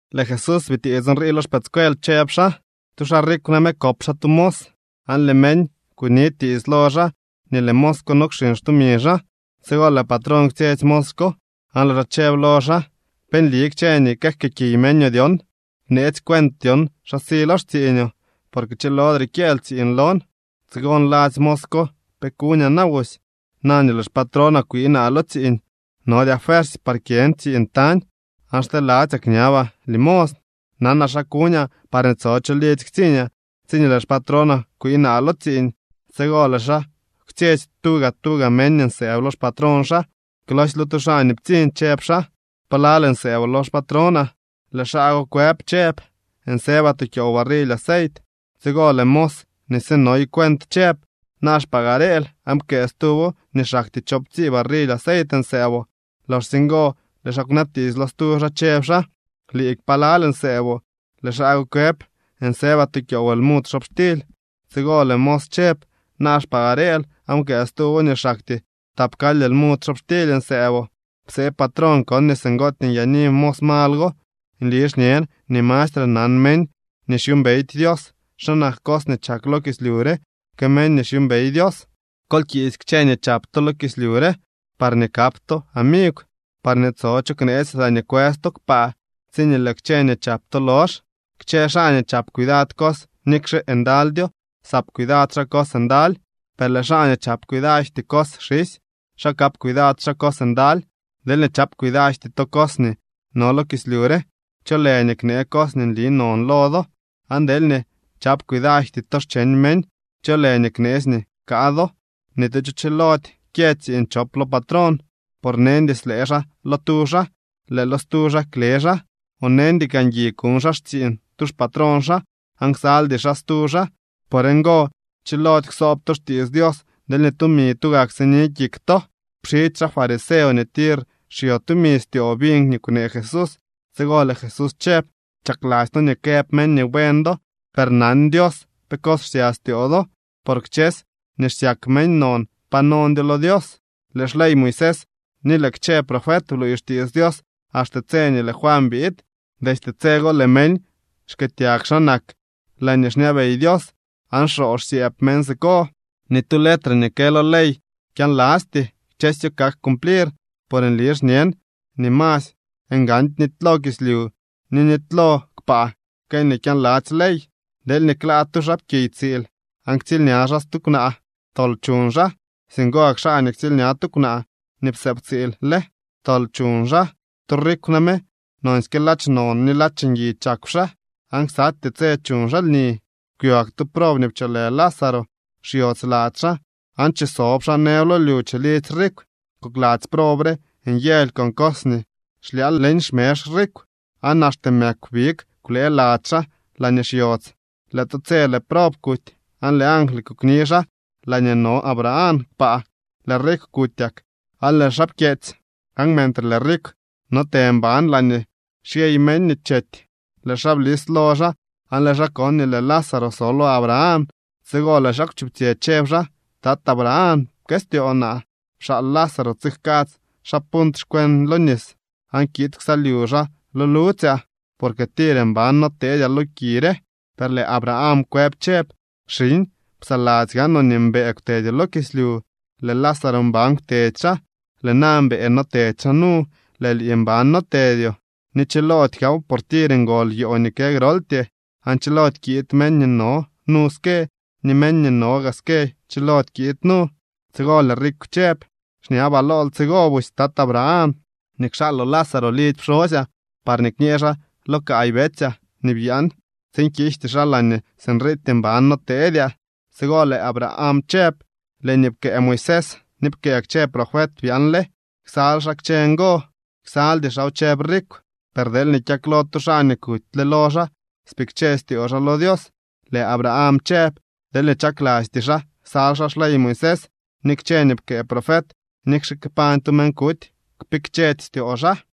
Lëë Jesús bitiits nrii lo xpëëdscuel, chëb xaa: —Tu xaa rikw name kop xaa tu mos, aan lëë meñ kuni tiits lo xaa nii lëë mos ko no kxiñ xtumi xaa. Tsigo lëë patrón kwtsyetsy mos ko, aan lëë xaa chëb lo xaa: “¿Pe nli kchë nii këjkëëkiy meñoo dyon? Bneetsy cuent dyon xa si lo xtsiiñoo, porque chilodre kyëël tsiiñ lon.” Tsigo nladzy mos ko: “¿Pe kuñaa na busy na nii lëë xpatrónaa kwii naa lo tsiiñ? Nodyaa fuersy par kyën tsiiñ tañ, aan xteladzyaa kñabaa limosn. Nanaa xa kuñaa parñee tso cho lidzy ktsiiñaa tsiñee lëë xpatrónaa kwii naa lo tsiiñ.” Tsigo lëë xaa kwtsyetsy tuga tuga meñ nii nsëëb lo xpatrón xaa. Klosy lo tu xaa nii ptsiñ chëb xaa: “¿Palal nsëëboo lo xpatrónaa?” Lëë xaa go kwëb chëb: “Nsëbaa tu kyoow barrily aceit.” Tsigo lëë mos nii sinoy cuent chëb: “Naa xpagareel aan pkëë stuwo nii xaktyee choowptsii barrily aceit nsëëboo.” Loxsye ngo lëë xaa kwnabtiits lo stu xaa, chëb xaa: “Liik, ¿palal nsëëboo?” Lëë xaa go kwëb: “Nsëbaa tu kyoow lmud xobxtily.” Tsigo lëë mos chëb: “Naa xpagareel aan pkëë stuwo nii xaktyee tapkaly lmud xobxtily nsëëboo.” Psee patrón kon nii singootyee nyaani mos mal go. Nli xñen nii mastre nan meñ nii xyuumbeydy Dios xa nak cos nii chak lo kislyu re que meñ nii xyuumbey Dios. ’Kol kiisy kchë nii chap to lo kislyu re parñee kap to amigw, parñee tso cho kneetsy laañee kwës to kpaa tsiñee lëë kchë nii chap to lox. ’Kchë xaa nii chap cuidad cos nikxe ndalydyo, sap cuidad xaa cos ndaly, per lëë xaa ni chap cuidajty cos xisy, xa kap cuidad xaa cos ndaly. Deelñee chap cuidajty to cos nii no lo kislyu re, ¿cho lë nii knee cos nii nli non lo do? Aan deelñee chap cuidajty to xcheñ meñ, ¿cho lë nii kneetsy nii jkaa do? ’Ni tu cho chilody kyë tsiiñ chop lo patrón. Por neñdy slëë xaa lo tu xaa, lëë lo stu xaa kle xaa. O neñdy kaa ngui kuñ xaa xtsiiñ tu xpatrón xaa, aan ksaldy xaa stu xaa. Por ngo chilody ksoob to xtiits Dios deelñee tumi tugak sini kik to. Pxidzy xaa fariseo nii tir xyo tumi styoo biñ nii kwnee Jesús. Tsigo lëë Jesús chëb: —Chakladzy to nii këb meñ nii buen do, per nan Dios pe cos xsya styoo do. Por kchësy nii xsyak meñ non pa nondyo lo Dios. ’Lëë xley Moisés ni lëë kchë profet bluuy xtiits Dios axte tse nii lëë Juan biid. Destye tse go lëë meñ xkëëtyag xa nak laañee xñabey Dios aan xoo xsyëëb meñ siko. ’Ni tu letre nii kë lo ley kyaanlasty. Kchësyo kak cumplir. Por nli xñen nii masy ngandy nitylo kislyu ni nitylo kpaa que nii kyaanladzy ley. ’Deelñee klaa tu xaapkiy tsiil, aan ktsiilña xaa stu kwnaa, tol chuñ xaa. Singo gak xaa nii ktsiilña tu kwnaa nii psëëb tsiil le, tol chuñ xaa. ’Tu rikw name nonsyke ladx non ni ladx ngui chakw xaa, aan ksatyee tse chuñ xaa lni. Kwyo gak tu prob nii pcholë Lázaro. Xyodz lady xaa aan chisob xaa nëb lo lyu chilidzy rikw. Kokladzy prob re nyëly con cos nii xlyaal leñ xmezh rikw. Aan axte mëkw big kwlee lady xaa laañee xyodz. Lëë tu tse lëë prob kuty, aan lëë angly kukni xaa laañee no Abraham kpaa. Lëë rikw kutyak, aan lëë xaa pkyeetsy. Aan mentre lëë rikw no te mban laañee xyey meñ nii chety, lëë xaa blis lo xaa aan lëë xaa kon nii lëë Lázaro so lo Abraham. Tsigo lëë xaa kwchuptsyë, chëb xaa: “Tat Abraham, pkëstyoo naa. Pxaal Lázaro tsijkadz xaa punt xkweñ lo nis aan kiid ksalyu xaa lo ludzyaa, porque tir mban no teedyaa lo ki re.” Per lëë Abraham kwëb chëb: “Xiñ, psaladzy gaanoo nii mbëë kwtedyoo lo kislyu, lëë Lázaro mban kwtedy xaa. Lëë na mbëë notedy xaa nu, lëë lii mban notedyoo. Ni chilody gaaw, por tir ngol yoo nii kë groltyee, aan chilody kiid meñ nii no nu ske, ni meñ nii no gaa ske chilody kiid nu.” Tsigo lëë rikw chëb: “Xñabaa lool tsigo busy, Tat Abraham, nii kxaaloo Lázaro lidzy pxosyaa, parñee kñee xaa lo kaay betsyaa nii byaan tsiin kiijty xaa laañee sinriityee mban noteedyaa.” Tsigo lëë Abraham chëb: “Lëë nii pkëë Moisés ni pkëë kchë profet byaanle. ¡Ksal xaa kchë ngo!” “Ksaldy xaaw”, chëb rikw, “per deelñee kyaklo tu xaa nii kutyle lo xaa, spikche styoo xaa lo Dios.” Lëë Abraham chëb: “Deelñee chaklasty xaa ksal xaa xley Moisés ni kchë nii pkëë profet, nikxe kpañ tu meñ kuty, kpikchedy styoo xaa.”